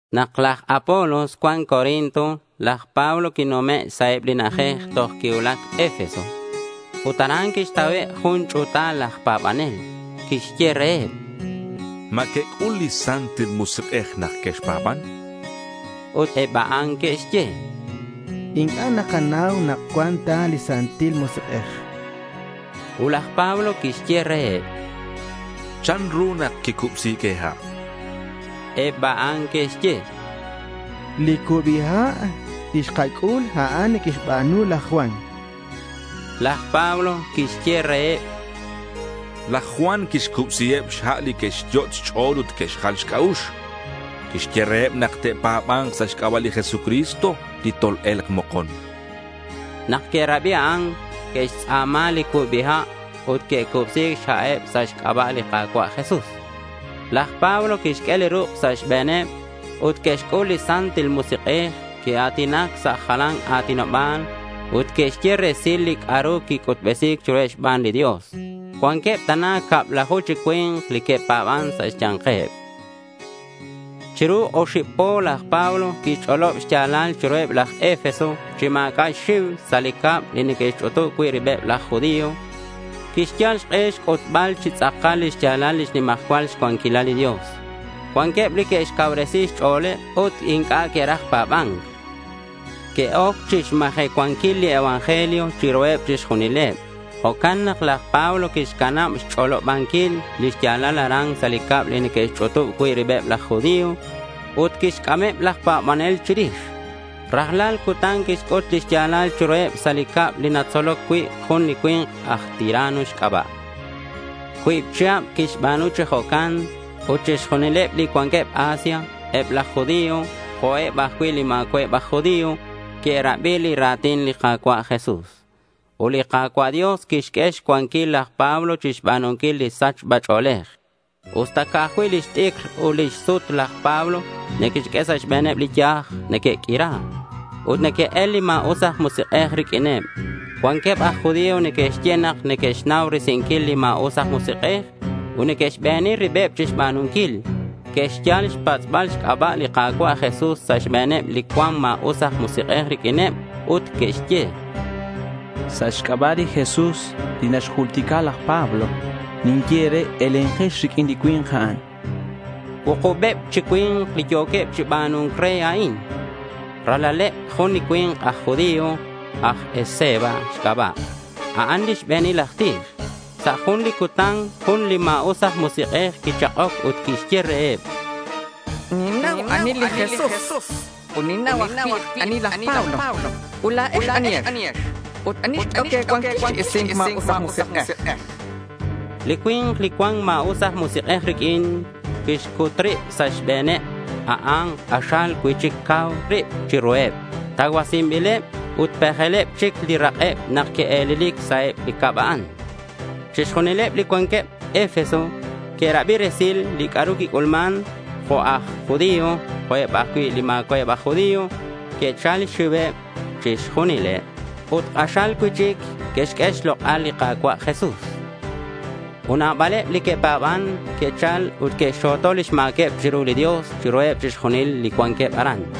Nak laj Apolos cuan Corinto laj Pablo quinume' sa' eb li na'ajej toj quicuulac Efeso. Ut aran quixtauheb jun ch'u̱taleb laj pa̱banel. Quixye reheb: —¿Ma quec'ul li Santil Musik'ej nak quexpa̱ban? chan laj Pablo reheb. Ut eb a'an que'xye: —Inc'a' nakanau nak cuan ta li Santil Musik'ej, chanqueb. Ut laj Pablo quixye reheb: —¿Chanru nak quicubsi̱c e̱ha'? Eb a'an que'xye: —Li cubi ha' li xkac'ul, a'an li quixba̱nu laj Juan, chanqueb. Laj Pablo quixye reheb: —Laj Juan quixcubsiheb xha' li que'xyot' xch'o̱l ut que'xjal xc'a'ux. Quixye reheb nak te'pa̱ba̱nk sa' xc'aba' li Jesucristo li tol-e̱lk mokon, chan. Nak que'rabi a'an, que'xtz'a̱ma li cubi ha' ut quicubsi̱c xha'eb sa' xc'aba' li Ka̱cua' Jesús. Laj Pablo quixq'ue li ruk' sa' xbe̱neb ut que'xc'ul li Santil Musik'ej. Que'a̱tinac sa' jalan a̱tinoba̱l ut que'xye resil li c'a'ru quic'utbesi̱c chiruheb xban li Dios. Cuanqueb tana cablaju chi cui̱nk li que'pa̱ban sa' xya̱nkeb. Chiru oxib po laj Pablo quixch'olob li xya̱lal chiruheb laj Efeso chi ma̱c'a' xxiu sa' li cab li neque'xch'utub cui' ribeb laj judío. Quixyal xk'e xc'utbal chi tz'akal lix ya̱lal lix nimajcual cuanquilal li Dios. Cuanqueb li que'xcacuubresi xch'o̱leb ut inc'a' que'raj pa̱ba̱nc. Que'oc chixmajecuanquil li evangelio chiruheb chixjunileb. Jo'can nak laj Pablo quixcanab xch'olobanquil li xya̱lal aran sa' li cab li neque'xch'utub cui' ribeb laj judío. Ut quixc'ameb laj pa̱banel chirix. Rajlal cutan quixc'ut li xya̱lal chiruheb sa' li cab li natzoloc cui' jun li cui̱nk aj Tirano xc'aba'. Cuib chihab quixba̱nu chi jo'ca'in. Ut chixjunileb li cuanqueb Asia, eb laj judío, jo'eb ajcui' li ma̱cua'eb aj judío, que'rabi li ra̱tin li Ka̱cua' Jesús. Ut li Ka̱cua' Dios quixq'ue xcuanquil laj Pablo chixba̱nunquil li sachba ch'o̱lej. Usta ca'aj cui' lix t'icr ut lix sut laj Pablo neque'xq'ue sa' xbe̱neb li yaj, neque'q'uira. Ut neque'el li ma̱us aj musik'ej riq'uineb. Cuanqueb aj judío neque'xye nak neque'xnau risinquileb li ma̱us aj musik'ej ut neque'xbeni ribeb chixba̱nunquil. Que'xyal xpatz'bal xc'aba' li Ka̱cua' Jesús sa' xbe̱neb li cuan ma̱us aj musik'ej riq'uineb ut que'xye: —Sa' xc'aba' li Jesús li naxjultica laj Pablo, tinye e̱re elenkex riq'uin li cui̱nk a'an, chanqueb. Cuukubeb chi cui̱nk li yo̱queb chi ba̱nu̱nc re a'in. Ralaleb jun li cui̱nk aj judío, aj Esceva xc'aba'. A'an li xbe̱nil aj tij. Sa' jun li cutan jun li ma̱us aj musik'ej quichak'oc ut quixye reheb: —Ninnau ani li Jesús, ut ninnau ajcui' ani laj Pablo. Ut la̱ex, ¿anihex? Ut ¿ani xq'uehoc e̱cuanquil chi isi̱nc ma̱us aj musik'ej? chan reheb. Li cui̱nk li cuan ma̱us aj musik'ej riq'uin, quixcut rib sa' xbe̱neb. A'an k'axal cui'chic cau rib chiruheb. Tacuasinbileb ut pejeleb chic li rak'eb nak que'e̱lelic sa' li cab a'an. Chixjunileb li cuanqueb Efeso que'rabi resil li c'a'ru quic'ulman, jo' aj judío jo' eb ajcui' li ma̱cua'eb aj judío. Quichal xxiuheb chixjunileb ut k'axal cui'chic que'xq'ue xlok'al li Ka̱cua' Jesús. Ut nabaleb li que'pa̱ban que'chal ut que'xxo̱to lix ma̱queb chiru li Dios chiruheb chixjunileb li cuanqueb aran.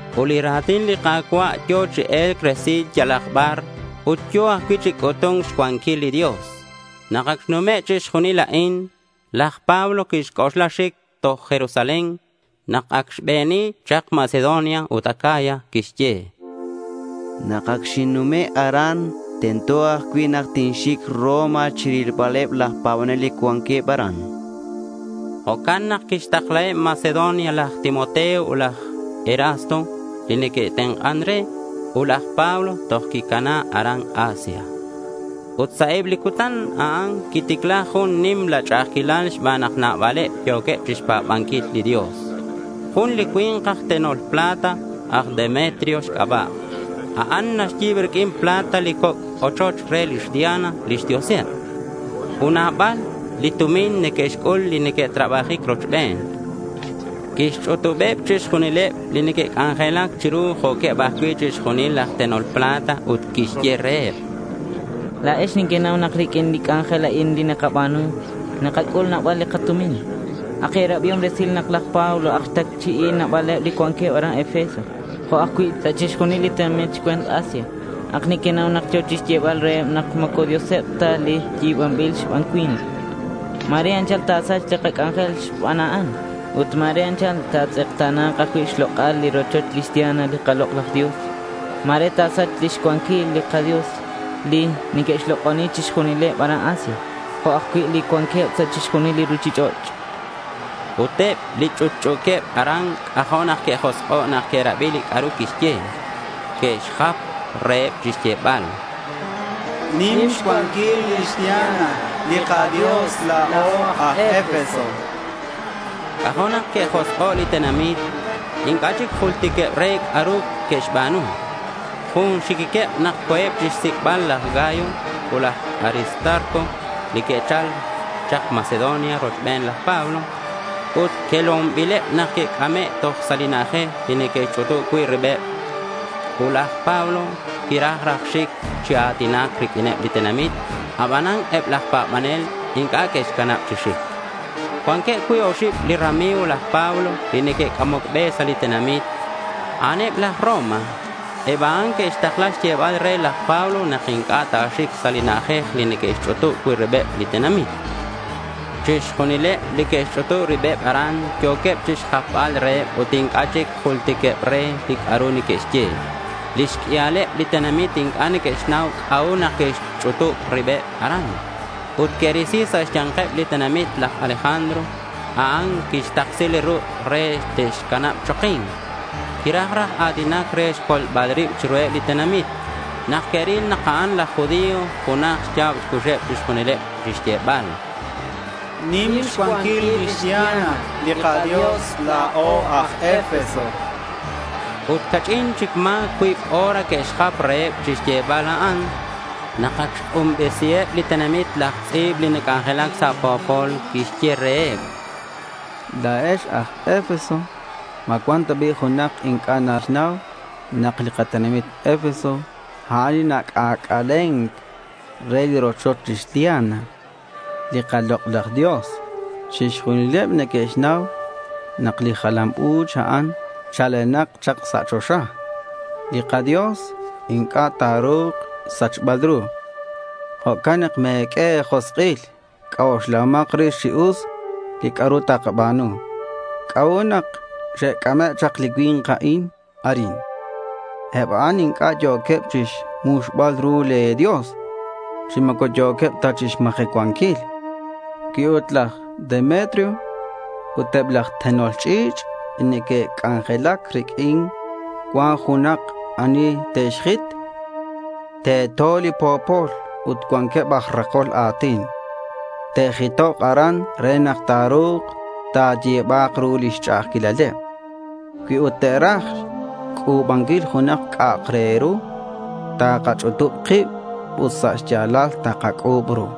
Ut li ra̱tin li Ka̱cua' yo̱ chi e̱lc resil yalak bar ut yo̱ ajcui' chi c'utu̱nc xcuanquil li Dios. Nak ac xnume' chixjunil a'in, laj Pablo quixc'oxla xic toj Jerusalén, nak acak xbeni chak Macedonia ut Acaya. Quixye: —Nak acak xinnume' aran, tento ajcui' tinxic Roma chirilbaleb laj pa̱banel li cuanqueb aran, chan. Jo'can nak quixtaklaheb Macedonia laj Timoteo ut laj Erasto, li neque'tenk'an re. Ut laj Pablo toj quicana aran Asia. Ut sa' eb li cutan a'an quiticla jun nimla ch'a'ajquilal xban nak nabaleb yo̱queb chixpa̱banquil li Dios. Jun li cui̱nk aj tenol plata, aj Demetrio xc'aba'. A'an naxyi̱b riq'uin plata li coc' ochoch re lix Diana lix dioseb. Ut nabal li tumin neque'xc'ul li neque'trabajic rochben. Quixch'utubeb chixjunileb li neque'c'anjelac chiru jo'queb ajcui' chixjunileb laj tenol plata ut quixye reheb: —La̱ex nequenau nak riq'uin li c'anjel a'in nakaba̱nu, nakac'ul nabal li katumin. Ac e̱rabiom resil nak laj Pablo ac xtacchi'i nabaleb li cuanqueb aran Efeso jo' ajcui' sa' chixjunil li tenamit xcue̱nt Asia. Ac nequenau nak yo̱ chixyebal reheb nak moco dioseb ta li yal yi̱banbil xban cui̱nk. Ma̱re anchal ta̱sachk li kac'anjel xban a'an. Ut ma̱re anchal ta̱tz'ekta̱na̱k ajcui' xlok'al li rochoch lix Diana li kalok'laj dios. Ma̱re ta̱sachk lix cuanquilal li kadios li neque'xlok'oni chixjunileb aran Asia, jo' ajcui' li cuanqueb sa' chixjunil li ruchich'och', chan laj Demetrio. Ut eb li ch'utch'u̱queb aran c'ajo' nak que'josk'o' nak que'rabi li c'a'ru quixye. Que'xjap reheb chixyebal: —¡Nim xcuanquil lix Diana li kadios la̱o aj Efeso! chanqueb. C'ajo' nak que'josk'o' li tenamit. Inc'a' chic jultiqueb re c'a'ru neque'xba̱nu. Jun xiquiqueb nak co̱eb chixsic'bal laj Gayo ut laj Aristarco li que'chal chak Macedonia rochben laj Pablo. Ut quelonbileb nak que'c'ame' toj sa' li na'ajej li neque'xch'utub cui' ribeb. Ut laj Pablo quiraj raj xic chi a̱tinac riq'uineb li tenamit, abanan eb laj pa̱banel inc'a' que'xcanab chi xic. Cuanqueb cuib oxib li rami̱g laj Pablo li neque'c'amoc be sa' li tenamit. A'aneb aj Roma. Eb a'an que'xtakla xyebal re laj Pablo nak inc'a' ta̱xic sa' li na'ajej li neque'xch'utub cui' ribeb li tenamit. Chixjunileb li que'xch'utub ribeb aran yo̱queb chixjapbal reheb ut inc'a' chic jultiqueb re li c'a'ru neque'xye. Lix q'uialeb li tenamit inc'a' que'xnau c'a'ut nak que'xch'utub ribeb aran. Ut que'risi sa' xya̱nkeb li tenamit laj Alejandro. A'an quixtaksi li ruk' re te'xcanab choki̱nc. Quiraj raj a̱tinac re xcolbal rib chiruheb li tenamit. Nak que'ril nak a'an aj judío junaj xya̱b xcuxeb chixjunileb chixyebal: —¡Nim xcuanquil lix Diana li kadios la̱o aj Efeso! chanqueb. Ut ca'ch'in chic ma̱ cuib o̱r que'xjap reheb chixyebal a'an. Nak ac xk'unbesiheb li tenamit laj tz'i̱b li nac'anjelac sa' po̱pol, quixye reheb: —La̱ex aj Efeso, ¿ma cuan ta bi' junak inc'a' naxnau nak li katenamit Efeso, a'an li nac'ac'alen re li rochoch lix Diana, li kalok'laj dios? Chixjunileb neque'xnau nak li jalam u̱ch a'an chalenak chak sa' choxa. Li kadios inc'a' ta̱ru̱k xsachbal ru. Jo'can nak me̱q'ue e̱josk'il. C'oxlahomak rix chi us li c'a'ru te̱ba̱nu. ¿C'a'ut nak xec'ameb chak li cui̱nk a'in arin? Eb a'an inc'a' yo̱queb chixmuxbal ru le̱ dios, chi moco yo̱queb ta chixmajecuanquil. Cui ut laj Demetrio ut eb laj tenol ch'i̱ch' li neque'c'anjelac riq'uin cuan junak ani te'xjit, teto li po̱pol ut cuanqueb aj rakol a̱tin. Te'jitok aran re nak ta̱ru̱k ta̱yi̱ba̱k ru lix ch'a'ajquilaleb. Cui ut te̱raj xc'u̱banquil junak c'a'ak re ru, takach'utub kib ut sa' xya̱lal takac'u̱b ru.